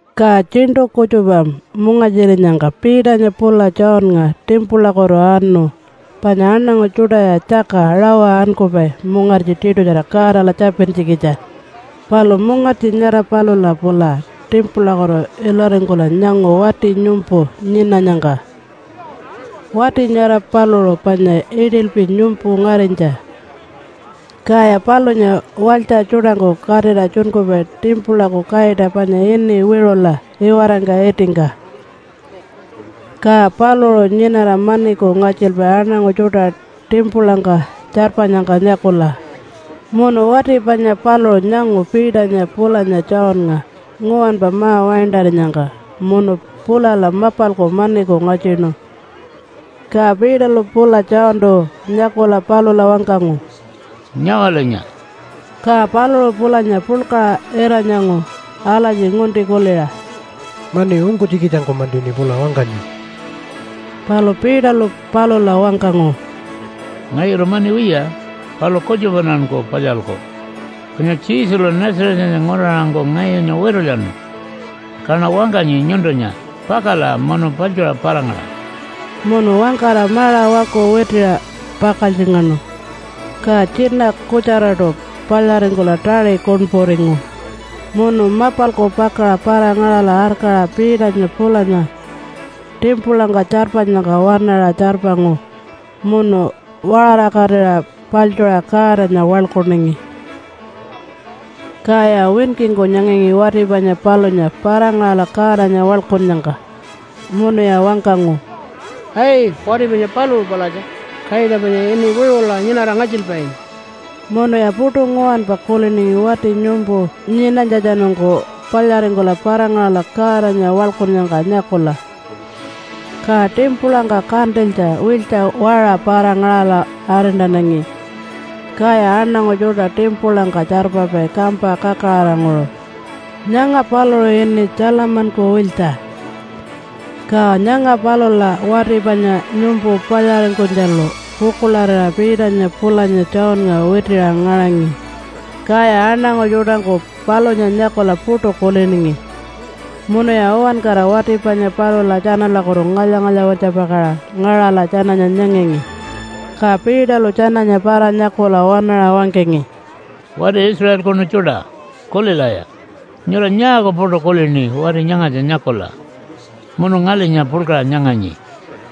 Ka tjiṉṯu kutjupa mungartjirinyangka Peternya pula Johnnga timpulakutu anu panya aṉangu tjuṯaya tjaka rawa ankupai mungartji tiṯutjara Godala tjapintjikitja. Palu mungartji nyara palula pula timpulakutu ilaringkula nyangu wati nyumpu nyinanyangka. Wati nyara paluṟu panya iṯilpi nyumpu ngarinytja, kaya palunya walytja tjuṯangku katira tjunkupai timpulaku kaita panya ini Wiṟula iwarangka itingka, ka paluṟu nyinara maniku ngatjilpai aṉangu tjuṯa timpulangka tjarpanyangka nyakula. Munu wati panya paluṟu nyangu Peternya pulanya Johnnga nguwanpa ma-waintarinyangka munu pulala mapalku maniku ngatjinu. Ka Peterlu pula Johntu nyakula palula wangkangu, “Nyawalinya!” Ka paluṟu pulanya puḻkaṟa ira-nyangu alatji ngunti kuliṟa, “Mani ungkunytjikitjangku-mantiṉi pula wangkanyi.” Palu Peterlu palula wangkangu, “Ngayulu mani wiya, palu kutjupaṉanku palyalku. Panya Jesulu Nazarethanya nguraṟangku ngayunya witulyanu, kaṉa wangkanyi nyuntunya, ‘Pakala munu paḻtjuṟa para-ngaṟa.’” Munu wangkara maṟa waku witiṟa pakaltjingaṉu, ka tjina kutjaraṯu palyaringkula taṟi kuṉpuringu. Munu mapalku pakaṟa para-ngaṟala arkaṟa Peternya pulanya timpulangka tjarpanyangka waṉaṟa tjarpangu munu waṟarakatira paḻtjuṟa Godanya waḻkuningi. Kaya winkingku nyangangi wati panya palunya para-ngaṟala Godanya waḻkunnyangka. Munuya wangkangu, “Ai! Wati panya paluṟu palatja! Kaita panya ini ‘Wiṟula’ nyinara ngatjilpainya!” Munuya puṯu nguwanpa kuliningi wati nyumpu nyinanytjatjanungku palyaringkula para-ngaṟala Godanya waḻkunnyangka nyakula. Ka timpulangka kantilytja wiltja waṟa para-ngaṟala arintanangi. Kaya aṉangu tjuṯa timpulangka tjarpapai kampa kakaraṟanguṟu. Nyanga paluṟu ini Tjalamanku Wiltja. Ka nyanga palula wati panya nyumpu palyaringkunytjalu pukuḻarira Peternya pulanya Johnnga witiṟa ngaṟangi. Kaya aṉangu tjuṯangku palunya nyakula puṯu kuliningi, munuya uwankara wati panya palula tjanalakutu ngalya-ngalya-wirtjapakaṟa ngaṟala tjananya nyangangi. Ka Peterlu tjananya para-nyakula waṉaṟa wangkangi, “Wati Israelkunu tjuṯa! Kulilaya! Nyura nyaaku puṯu kulini wati nyangatja nyakula munu ngalinya puḻkaṟa nyanganyi?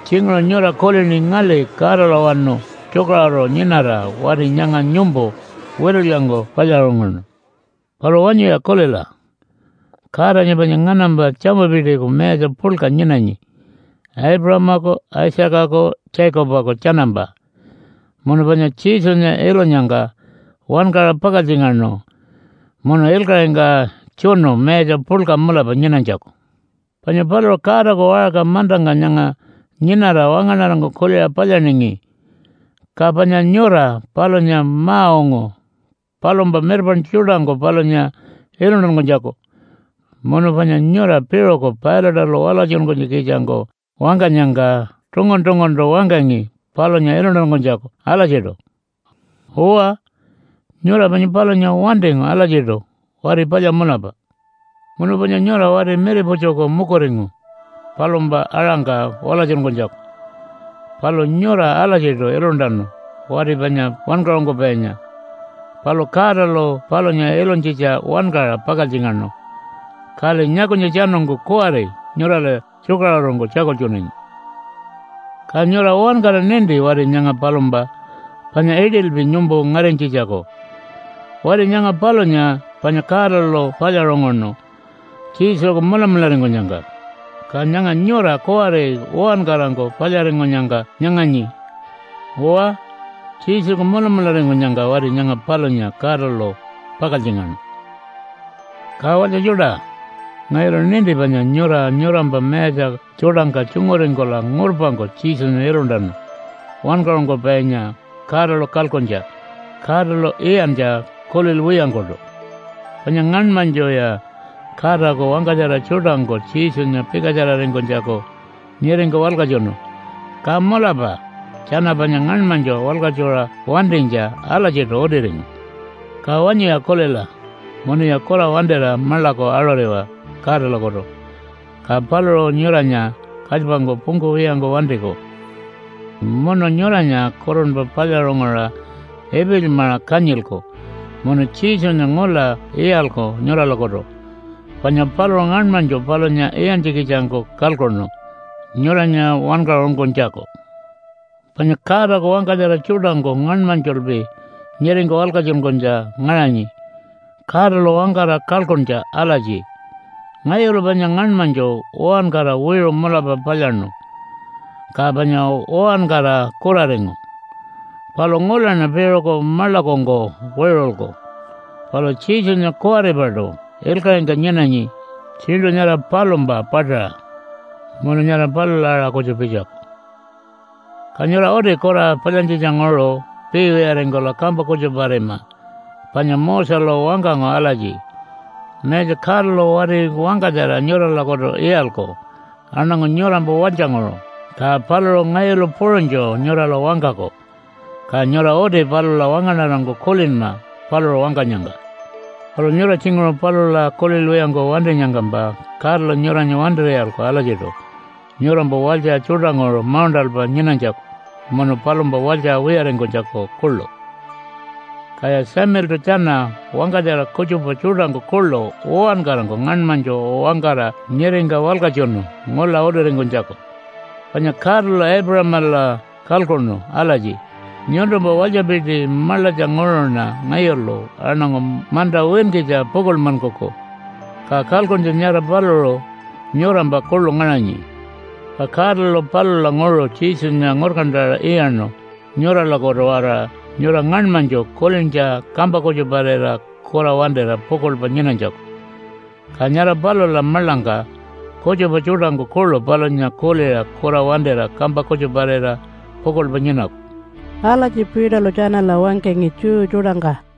Tjinguṟu nyura kulini ngali Godalawanu tjukaṟuru nyinara wati nyanga nyumpu witulyangku palyaṟunguṉu. Palu wanyuya kulila! Godanya panya nganampa tjamupitiku mayatja puḻka nyinanyi Aipuṟamaku Isaacaku Jacobaku tjanampa, munu panya Jesunya ilunyangka wankaṟa pakaltjingaṉu munu ilkaṟingka tjunu mayatja puḻka mulapa nyinanytjaku. Panya paluṟu Godaku waṟka mantangka nyanga nyinara wangaṉarangku kuliṟa palyaningi, ka panya nyura palunya ma-ungu palumpa mirpaṉtju tjuṯangku palunya iluntankunytjaku. Munu panya nyura piṟuku Pilate-alu walatjunkunytjikitjangku wangkanyangka tungun-tunguntu wangkangi palunya iluntankunytjaku alatjiṯu. Uwa, nyura panya palunya wantingu alatjiṯu wati palya mulapa. Munu panya nyura wati miriputjuku mukuringu palumpa aṟangka walatjunkunytjaku. Palu nyura alatjiṯu iluntanu wati panya wankaṟunkupainya, palu Godalu palunya ilunytjitja wankaṟa pakaltjingaṉu, kali nyakunytjatjanungku kuwari nyurala tjukaṟurungku tjakultjunanyi. “Ka nyura uwankara ninti wati nyanga palumpa, panya iṯilpi nyumpu ngarinytjitjaku. Wati nyanga palunya panya Godalu palyaṟunguṉu Jesuku mulamularingkunyangka, ka nyanga nyura kuwari uwankarangku palyaringkunyangka nyanganyi. Uwa, Jesuku mulamularingkunyangka wati nyanga palunya Godalu pakaltjingaṉu. “Ka walytja tjuṯa! Ngayulu ninti panya nyura nyurampa mayatja tjuṯangka tjunguringkula ngurpangku Jesunya iluntanu Wankaṟunkupainya Godalu kalkuntja, Godalu iyantja kulilwiyangkuṯu. Panya ngaṉmanytjuya Godaku wangkatjara tjuṯangku Jesunya pikatjararingkunytjaku nyiringka walkatjunu, ka mulapa tjana panya ngaṉmanytju walkatjuṟa wantinytja alatjiṯu utiringu. Ka wanyuya kulila, munuya kura wantira maḻaku aṟuriwa Godalakutu, ka paluṟu nyuranya kalypangku pungkuwiyangku wantiku. Munu nyuranya kurunpa palyaṟunguṟa ipilymaṟa kanyilku munu Jesunya ngula iyalku nyuralakutu, panya paluṟu ngaṉmanytju palunya iyantjikitjangku kalkuṉu nyuranya wankaṟunkunytjaku. Panya Godaku wangkatjara tjuṯangku ngaṉmanytjulpi nyiringka walkatjunkunytja ngaṟanyi Godalu wangkara kalkuntja alatji, ‘Ngayulu panya ngaṉmanytju uwankara wiṟu mulapa palyaṉu, ka panya uwankara kuraringu, palu ngulaṉa piṟuku maḻakungku wiṟulku.’ Palu Jesunya kuwaripaṯu ilkaṟingka nyinanyi tjiṉṯu nyara palumpa paṯaṟa. Munu nyara palula aṟa kutju pitjaku. “Ka nyura uti kura palyantjitjanguṟu piiwiyaringkula kampa kutjuparima panya Moselu wangkangu alatji, ‘Mayatja Godalu wati wangkatjara nyuralakutu iyalku aṉangu nyurampa walytjanguṟu, ka paluṟu ngayulu puṟunytju nyurala wangkaku. Ka nyura uti palula wangaṉarangku kulinma paluṟu wangkanyangka. Palu nyura tjinguṟu palula kulilwiyangku wantinyangkampa Godalu nyuranya wantir'iyalku alatjiṯu nyurampa walytja tjuṯanguṟu mauṉṯalpa nyinanytjaku munu palumpa walytja wiyaringkunytjaku kuḻu.’ Kaya Samueltu tjana wangkatjara kutjupa tjuṯangku kuḻu uwankarangku ngaṉmanytju wangkara nyiringka walkatjunu ngula utiringkunytjaku. Panya Godalu Aipuṟamala kalkuṉu alatji, ‘Nyuntumpa walytjapiti maḻatjanguṟuṉa ngayulu aṉangu manta winkitja pukuḻmankuku.’ Ka kalkuntja nyara paluṟu nyurampa kuḻu ngaṟanyi. Ka Godalu palulanguṟu Jesunya ngurkantaṟa iyaṉu nyuralakutu-waraṟa nyura ngaṉmanytju kulintja kampa kutjuparira kura wantira pukuḻpa nyinanytjaku, ka nyara palula maḻangka kutjupa tjuṯangku kuḻu palunya kuliṟa kura wantira kampa kutjuparira pukuḻpa nyinaku.” Alatji Peterlu tjanala wangkangi Jew tjuṯangka.